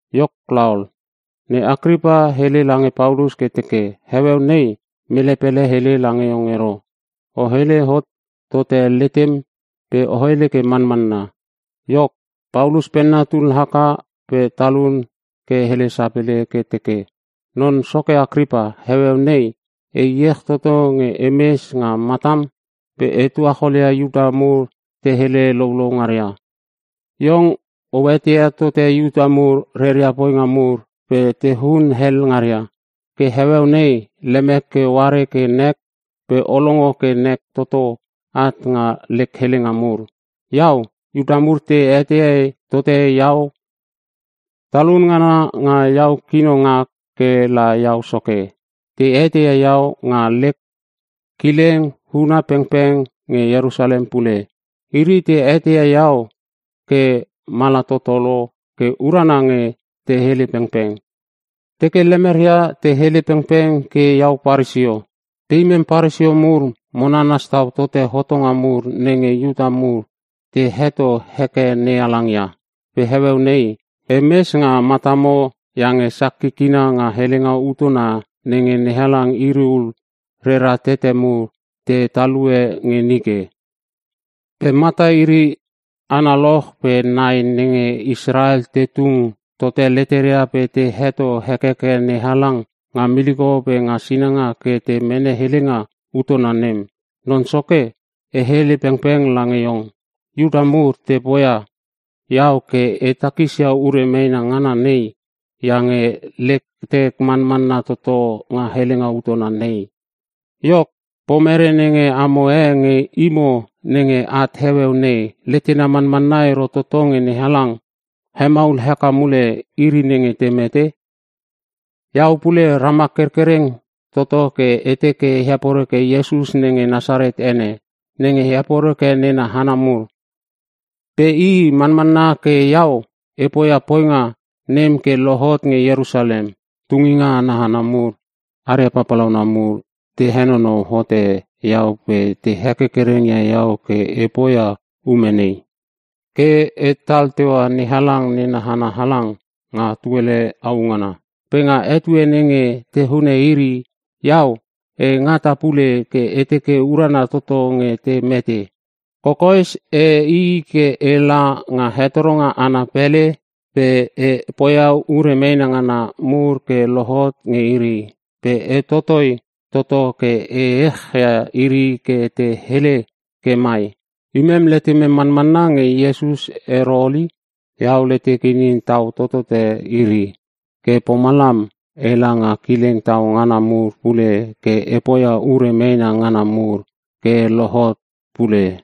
Iok laol, ne Akripa hele lange Paulus ke teke, “Heueu nei mele pele hele lange iong ero. O hele hot tote letem pe o hele ke manmanna.” Iok, Paulus penna tul haka pe talun ke hele sapele ke teke, “Non soke Akripa, heueu nei e iech toto nge e mes nga matam pe e tuacholia Iuta mur te hele louloulou ngaria. Iong o etei tote Iuta mur reria poinga mur pe tehun hel ngaria. Ke heueu nei lemek ke o are ke nek pe o longo ke nek toto at nga lek helenga mur. “Iau, Iuta mur te etei tote iau. Talun ngana nga iau kino ngak ke la iau soke. Te eteia iau nga lek kileng huna pengpeng pe nge Ierusalem pule. Iri te eteia iau ke mala toto lo ke urana nge te hele pengpeng. Teke lemeria te hele pengpeng ke iau Paresio. Pe imem Paresio mur mo nanas tau tote hotonga mur nenge Iuta mur te heto heke NeHalang ia. Pe heueu nei, e mes nga matamo iange sak kikina nga helenga utona nenge NeHalang iri ul rera tete mur te talue nge nike. Pe mata iri analoch pe nai nenge Israel te tung tote leteria pe te heto hekeke NeHalang nga miliko pe nga sinanga ke te mene helenga utona nem. Non soke, e hele pengpeng lange iong, Iuta mur te poia iau ke e takisia ure meena ngana nei iange letek manmanna toto nga helenga utona nei. Iok, pomere nenge amo e nge imo nenge at heueu nei, letena manmanna ero toto nge NeHalang hemaul heke mule iri nenge te mete? “Iau pule ramak kerkereng toto ke e teke e heporeke tote Iesus nenge Nasaret ene, nenge e heporeke nena hana mur. Pe i manmanna ke iau e poia poinga nem ke lohot nge Ierusalem. Tunginga ana hana mur aria papalauna mur te henonou hote iau pe te hekerkereng ia iau ke e poia ume nei. Ke etal teua NeHalang nena hana halang nga tuele au ngana. Pe nga etue nenge te hune iri, iau e ngata pule ke e teke urana toto nge te mete. Kokoes e i ke ela nga hetoronga ana pele pe e poia ure meena ngana mur ke lohot nge iri. Pe e totoi toto ke e echia iri ke te hele ke mai, ‘Imem letemem manmanna nge Iesus ero ol i.’ Iau letek inin tau totote iri, ke pomalam ela nga kileng tau ngana mur pule ke e poia ure meena ngana mur ke lohot pule.”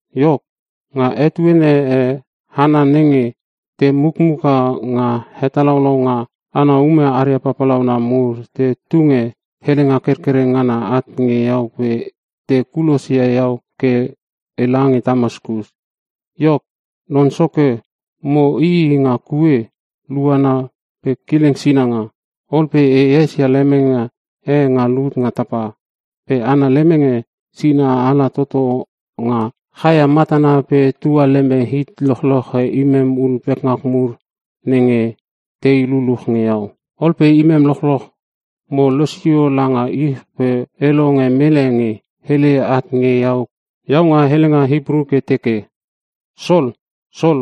“Iok, nga etuene e hana nenge te mukmuka nga hetalaulaunga ana ume aria papalauna mur te tunge helenga kerkerenga ngana at nge iau pe te kulosia iau ke e lange Tamaskus. Iok, non soke mo i i nga kue luana pe kileng sinanga. Ol pe e esia lemenge e nga lut nga tapa. Pe ana lemenge sina ala toto nga chaia matana pe tua leme it lochloche imem ul pekngak mur nenge tei luluch nge iau. Ol pe imem lochloch mo losio langa ich pe e longe mele nge hele at nge iau nga helenga Hipru ke teke, ‘Sol! Sol!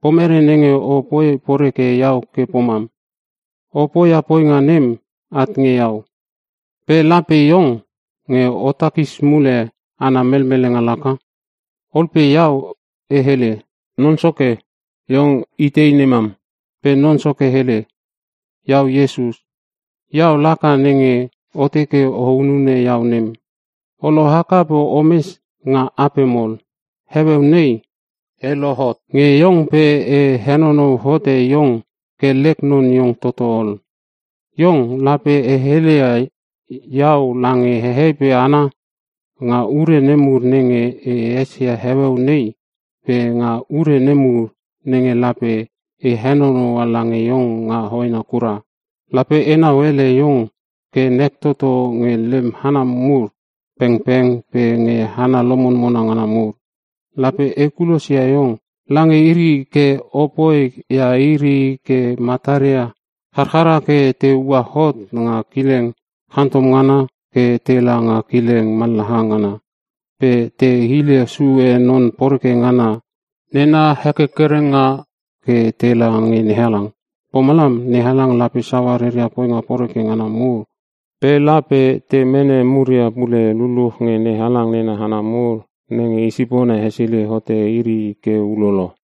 Pomere nenge o poi poreke iau ke pomam? O poia poinga nem at nge iau, pe lape iong nge o takis mule ana melmelenga laka.’ Ol pe iau e hele, ‘Non Soke, Iong itei nemam?!’ “Pe Non Soke hele, ‘Iau Iesus. Iau laka nenge o teke o hunune iau nem. O lohaka ke omes nga apem ol. Heueu nei e lohot nge iong pe e henonou hote iong ke lek non iong toto ol. Iong lape o heleia iau lange hehei pe hana nga ure nemur nenge o esia heueu nei pe nga ure nemur nenge lape e henonoua lange iong nga hoena kura. Lape enau ele iong ke nek toto nge lem hana mur pengpeng pe nge hana lomonmona ngana mur. Lape e kulosia iong lange iri ke o poia iri ke mataria charchara ke te ua hot nga kileng chantom ngana ke tela nga kileng mallaha ngana. Pe te hile sue non poreke ngana nena hekerkerenga ke tela nge NeHalang. Pomalam NeHalang lape saua reria poinga poreke ngana mur ke te lasus toto. Pe lape te mene muria pule luluch nge NeHalang nena hana mur nenge i sipona hesilei hote iri ke ulolo.’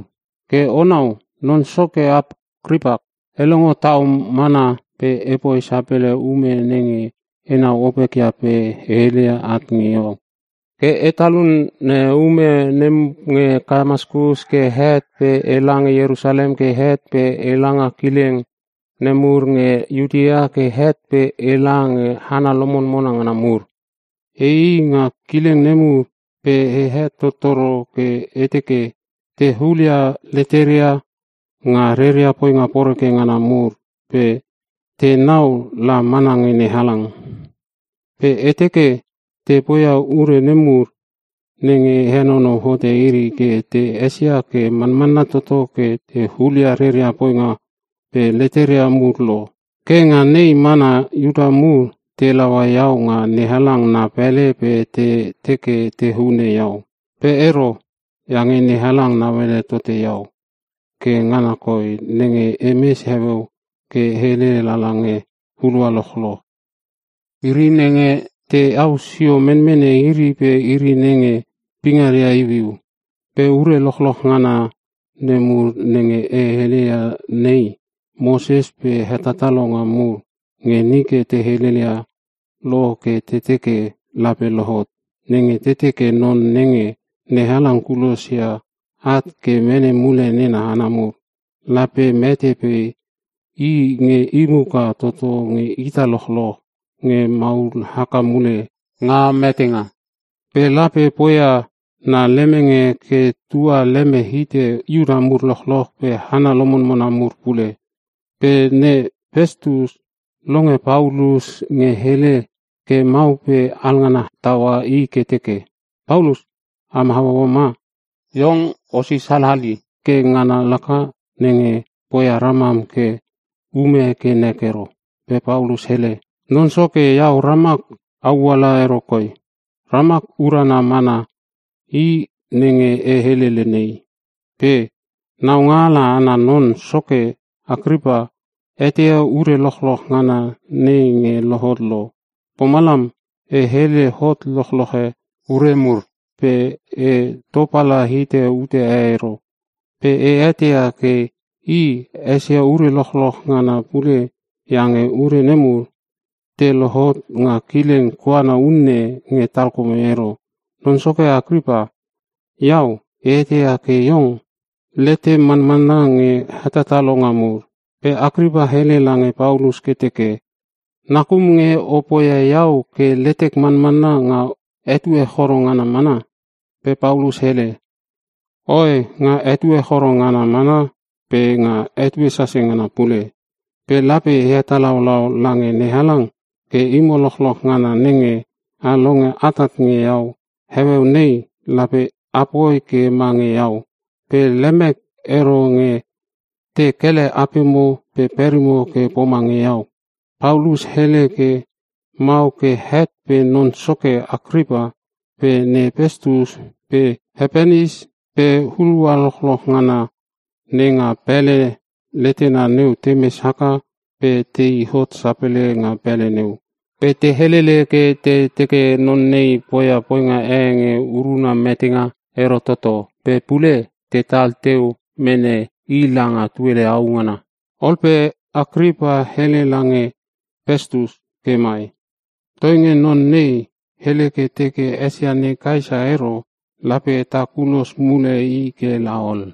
“Ke onau non soke Akripa, e longo tau mana pe epoi sapele ume nenge enau opekia pe te heleia at nge iau. Ke e talune ume nem nge Tamaskus ke het pe e lange Ierusalem ke het pe e la nga kileng nemur nge Iutea ke het pe ela nge hana lomonmona ngana mur. E i i nga kileng nemur pe e hetottoro ke e teke te hulia leteria nga reria poinga poreke ngana mur pe tenau la mana nge NeHalang. Pe e teke te poia ure nemur nenge henonou hote iri ke te esia ke manmanna toto ke te hulia reria poinga pe leteria mur lo. Ke nga nei mana Iuta mur te laua iau nga NeHalang na pele pe te teke te hune iau. Pe ero, iange NeHalang nauala tote iau. Ke ngana koi nenge emes heueu ke e hele lala nge hulua lochloch, iri nenge teau sio menmene iri pe iri nenge pingaria iuiu. Pe ure lochlolch ngana nemur nenge e helelel ia nei, Moses pe hetatalonga mur nge nike te helelia lo ke te teke lape lohot. Nenge te teke, Non nenge NeHalang kulosia at ke mene mule nena hana mur, lape mete pe i nge i muka toto nge ita lochloch nge maul haka mule nga metenga. Pe lape poia na lemenge ke tua leme hite Iuta mur lochloch pe hana lomonmona mur pule.” Pe ne Pestus longe Paulus nge hele ke mau pe alngana taua i ke teke, “Paulus! Am hauaua ma? Iong osis halali ke ngana laka nenge poia ramam ke ume ke nek ero.” Pe Paulus hele, “Non soke, iau ramak auala ero koi. Ramak urana mana i nenge e helele nei. Pe naungaala ana non soke Akripa eteia ure lochloch ngana nei nge lohot lo, pomalam e hele hot lochloche ure mur pe e topala hite ute e ero. Pe e eteia ke i esia ure lochloch ngana pule iange ure nemur, te lohot nga kileng koana unne nge talkome ero. Non soke Akripa, iau e eteia ke iong letem manmanna nge hetatalonga mur.” Pe Akripa hele lange Paulus ke teke, “Nakum nge o poia iau ke letek mamanna nga etue choro ngana mana?” Pe Paulus hele, “Oe! Nga etue choro ngana mana pe nga etue sase ngana pule. Pe lape e hetalaulau lange NeHalang ke imo lochloch ngana nenge a longo atat nge iau heueu nei, lape apoi ke mange iau. Pe lemek ero nge te kele apemo pe perimo ke pomange iau!” Paulus hele ke mau ke het pe non soke Akripa pe ne Pestus pe he Penis pe hulua lochloch ngana nenga pele letena neu temes haka pe te i hot sapele nga pele neu. Pe te helele ke te teke, “Non nei poia poinga e nge uruna metenga ero toto, pe pule tetal teu mene i langa tuele au ngana.” Ol pe Akripa hele lange Pestus ke mai, “Toinge non nei hele ke teke esia ne Kaesa ero, lape ta kulos mule i ke laol.”